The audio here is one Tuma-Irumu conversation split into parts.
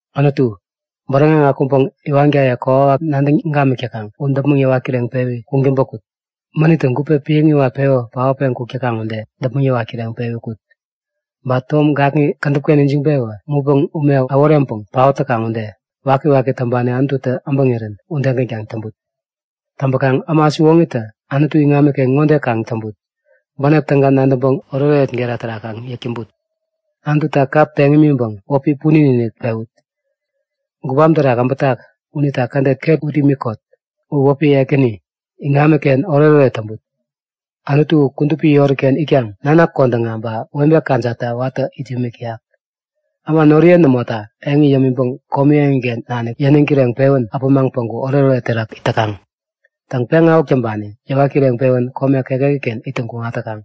Anutu, bäräŋeŋ akuŋpäŋ iwankaye kokwawak nadäŋ gamik täkaŋ u däpmäŋ yäwat-kireŋ-pewi kuŋtäŋpä kut! Mänittä gupe piäŋ iwat-pewän paotpeŋ kuk täkaŋ ude däpmäŋ yäwat kireŋpewi kut. Ba tom gakŋi kädäpken ijiŋpewä mutpäŋ ume äworeŋpäŋ paot täkaŋ ude, wakiwaki täŋpani Anututä äbäŋirän udegän kaŋ täŋput! Täŋpäkaŋ äma siwoŋitä Anutu iŋamiken ŋode kaŋ täŋput; Bänep täga nadäŋpäŋ oretoret gera kaŋ yäk täŋput! Anututa kap teŋ imiŋpäŋ wäpi punin-inik pewut! Gubam terak äbätak unita kädet ket ut imikot! U wäpi Ekäni, iŋamiken oretoret täŋput! Anutu u kudupi yoriken itkaŋ nanak kodäŋa ba webe kajatta watä it yämik täyak. Äma noriye nämota eŋi yämiŋpäŋ komi eŋiken nanik yäniŋ kireŋpewän äpämaŋ päŋku oretoret terak it täkaŋ. Täŋ peŋawäk täŋpani yäwat kireŋpewän kome kekekiken ittäŋ kuŋat täkaŋ.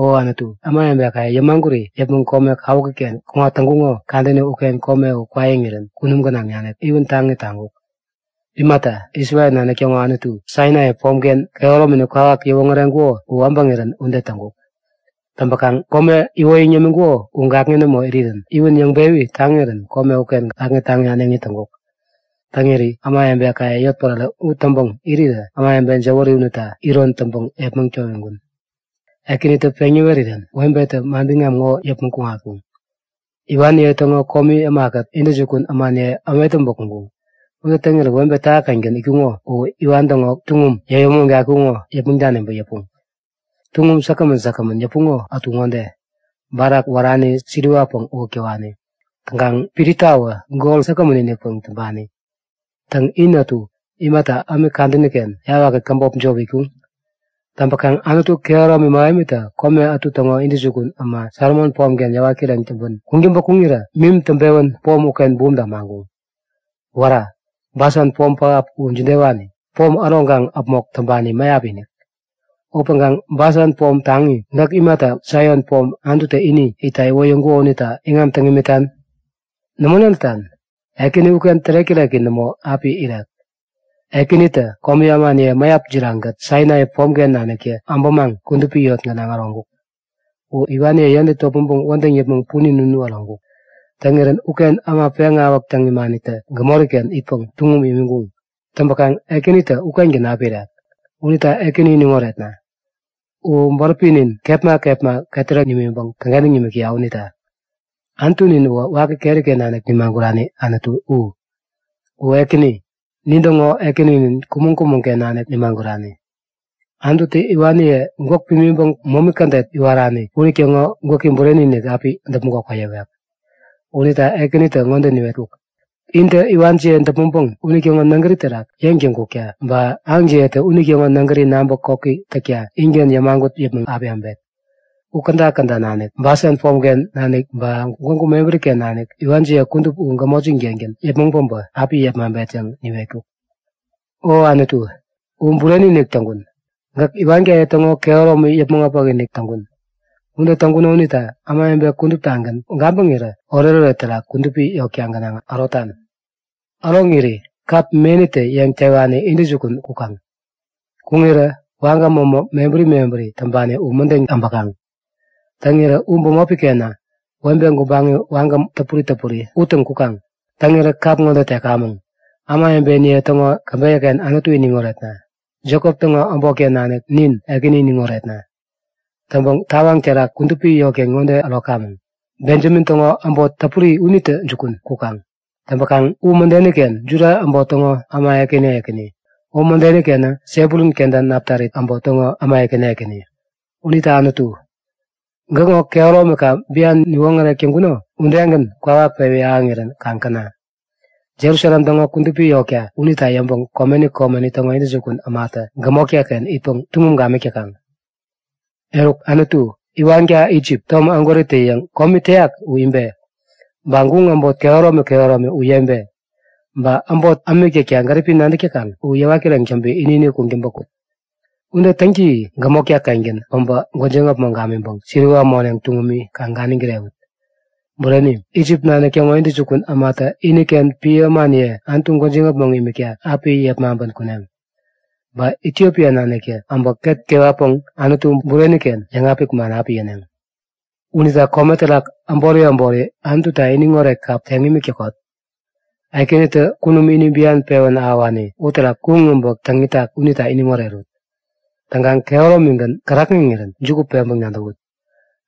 O Anutu, ämawebekaye yämaguri yäpmäŋ kome kawukiken kuŋat täŋkuŋo kadäni uken kome u kwaiŋirän kunum gänaŋ nanik iwän taŋi taŋkuk. Imata, Isrel nanik täŋo Anutu, Sainai pomken kehäromini kwawak yäwoŋäreŋkuko u äbäŋirän ude täŋkuk. Täŋpäkaŋ kome iwoyäŋ yämiŋkuno u gakŋi nämo irirän iwän yäŋpewi taŋirän kome uken gakŋi taŋi äneŋi täŋkuk. Täŋiri ämawebekaye yotpärare u täŋpäŋ irirä ämawebe jäwäri unita iron täŋpäŋ yepmäŋ towiŋkun. Ekänitä peŋ yäwerirän webetä manbiŋam ŋo yäpmäŋ kuŋatkuŋ; Iwaniye täŋo komi ämakät intäjukun ämaniye ämet täŋpä kuŋkuŋ. Ude täŋirä webe täha-kengän itkuŋo u iwan täŋo tuŋum yäyomägatkuŋo u yäpmäŋ daniŋpäŋ yäpuŋ. Tuŋum säkgämän säkgämän yäpuŋo ätu ŋode; Barak wärani siliwapäŋ uwäk täwani. Täŋkaŋ piritawä gol säkgämän-inikpäŋ täŋpani. Täŋ, in ätu imata ämik kadäniken yawakkät käbop jop itkuŋ? Täŋpäkaŋ Anutu kehäromi mähemitä kome ätu täŋo intäjukun äma Salmon pomken yäwat kireŋ täŋpän kuŋtäŋpä kuŋirä mim täŋpewän pom uken bumta maŋkuŋ. Wära! Basan pom pähap u jidewani? Pom äroŋkaŋ äpmok täŋpani mäyap-inik. Upäŋkaŋ Basan pom taŋi, gäk imata Saion pom Anututä ini itta iwoyäŋkuko unita iŋam täŋ imitan? Nämo nadätan? Ekäni uken tärek-täreki nämo api irek! Ekänitä komi ämaniye mäyap-jiraŋkät Sainai pomken naniktä äbämaŋ kudupi yori gänaŋ äroŋkuk. U iwaniye yentä topmäŋpäŋ wädäŋ yäpmäŋ punin unu äroŋkuk. Täŋirän uken äma peŋawäk täŋ imanitä gämoriken itpäŋ tuŋum imiŋkuŋ. Täŋpäkaŋ Ekänitä ukengän api irek. Unita Ekäni iniŋ oretna! U bäräpinin kepma kepma ketäreŋ nimiŋpäŋ täŋkentäŋ nimik täyak unita. Anutunin uwä waki keriken nanik nimagurani Anutu u. U Ekäni, nintäŋo Ekäninin kumäŋ-kumäŋ-ken nanik nimagurani. Anututä iwaniye, gwäk pimiŋpäŋ momi kädet iwarani unitäŋo gwäki bureni-inik api däpmäŋ kokoyäwek. Unita Ekänitä ŋode niwetkuk; Intä iwanjiye däpmäŋpäŋ unitäŋo nägäri terak yeŋtäŋ kukta, ba aŋjiyetä unitäŋo nägäri naŋpä koki täkta inken yämagut yäpmäŋ api äbet. Ukäda-käda nanik, Basan pomken nanik ba gwägu mebäriken nanik iwanjiye kudup u gämotjinken yäpmäŋ päbä api yepmaŋpet yäŋ niwetkuk. O Anutu, u bureni-inik täŋkun. Gäk iwankaye täŋo kehäromi yäpmäŋ äpäk-inik täŋkun. Ude täŋkuno unita ämawebe kuduptagän gabäŋirä oretoret terak kudupi yotka gänaŋ ärotan. Äroŋiri kap menitä yäŋ-tewani intäjukun kukaŋ. Kuŋirä wagäm mämä mebäri mebäri täŋpani u mäden äbäkaŋ. Täŋirä u bämopikenä webe gubaŋi wagäm täpuri täpuri uttäŋ kukaŋ. Täŋirä kap ŋode tekamäŋ; Ämawebeniye täŋo käbeyäken Anutu iniŋ oretna! Jekop täŋo äbotken nanik nin, Ekäni iniŋ oretna! Täŋpäŋ tawaŋ terak kudupi yotken ŋode ärokamäŋ; Bejamin täŋo äbot täpuri unitä jukun kukaŋ. Täŋpäkaŋ u mädeniken Juda äbot täŋo äma ekäni ekäni. U mädenikenä Sebulun kenta Naptali äbot täŋo äma ekäni ekäni. Unita Anutu, gäkŋo kehäromika bian niwoŋärek täŋkuno udegän kwawak pewi ahäŋirän kaŋ käna! Jerusalem täŋo kudupi yotka unita yäŋpäŋ komeni komeni täŋo intäjukun ämatä gämotkaken itpäŋ tuŋum gamik täkaŋ. Eruk Anutu, iwanka Isip, tom ägwäritä-yäŋ komi täyak u ibe! Ba guŋ äbot kehäromi kehäromi u yebe! Ba äbot ämik täkta gäripi nadäk täkaŋ u yäwat kireŋ täŋpi ini-ini kuŋtäŋpä kut! Ude täŋtäyi gämotka-kengän päbä gwäjiŋ äpmoŋ gamiŋpäŋ siliwa moneŋ tuŋumi kaŋ ganiŋ kirewut! Bureni, Isip nanik täŋo intäjukun ämatä iniken piä ämaniye Anutu gwäjiŋ äpmoŋ imikta api yepmaŋpän kuneŋ. Ba Itiopia naniktä äbä ket kewatpäŋ Anutu bureniken yäŋapik man api yäneŋ. Unita kome terak äbori äbori Anututa iniŋoret kap teŋ imik täkot! Ekänitä kunum ini bian pewän ahäwani uterak kuŋ äbäk täŋ itak unita iniŋ orerut! Täŋkaŋ kehäromigän kärakŋeŋirän juku peŋpäŋ nadäwut!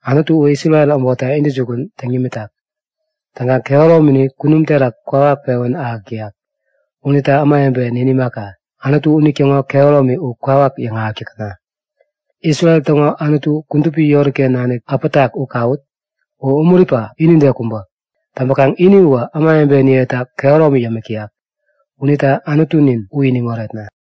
Anutu uwä Isrel äbotta intäjukun täŋ yämitak. Täŋkaŋ kehäromini kunum terak kwawak pewän ahäk täyak. Unita ämawebe nin imaka, Anutu unitäŋo kehäromi u kwawak yäŋahäk täkäna! Isrel täŋo Anutu kudupi yoriken nanik äpätak u kawut! U umuri pähap, inide kubä! Täŋpäkaŋ ini uwä ämawebeniyeta kehäromi yämik täyak. Unita Anutunin u iniŋ oretna!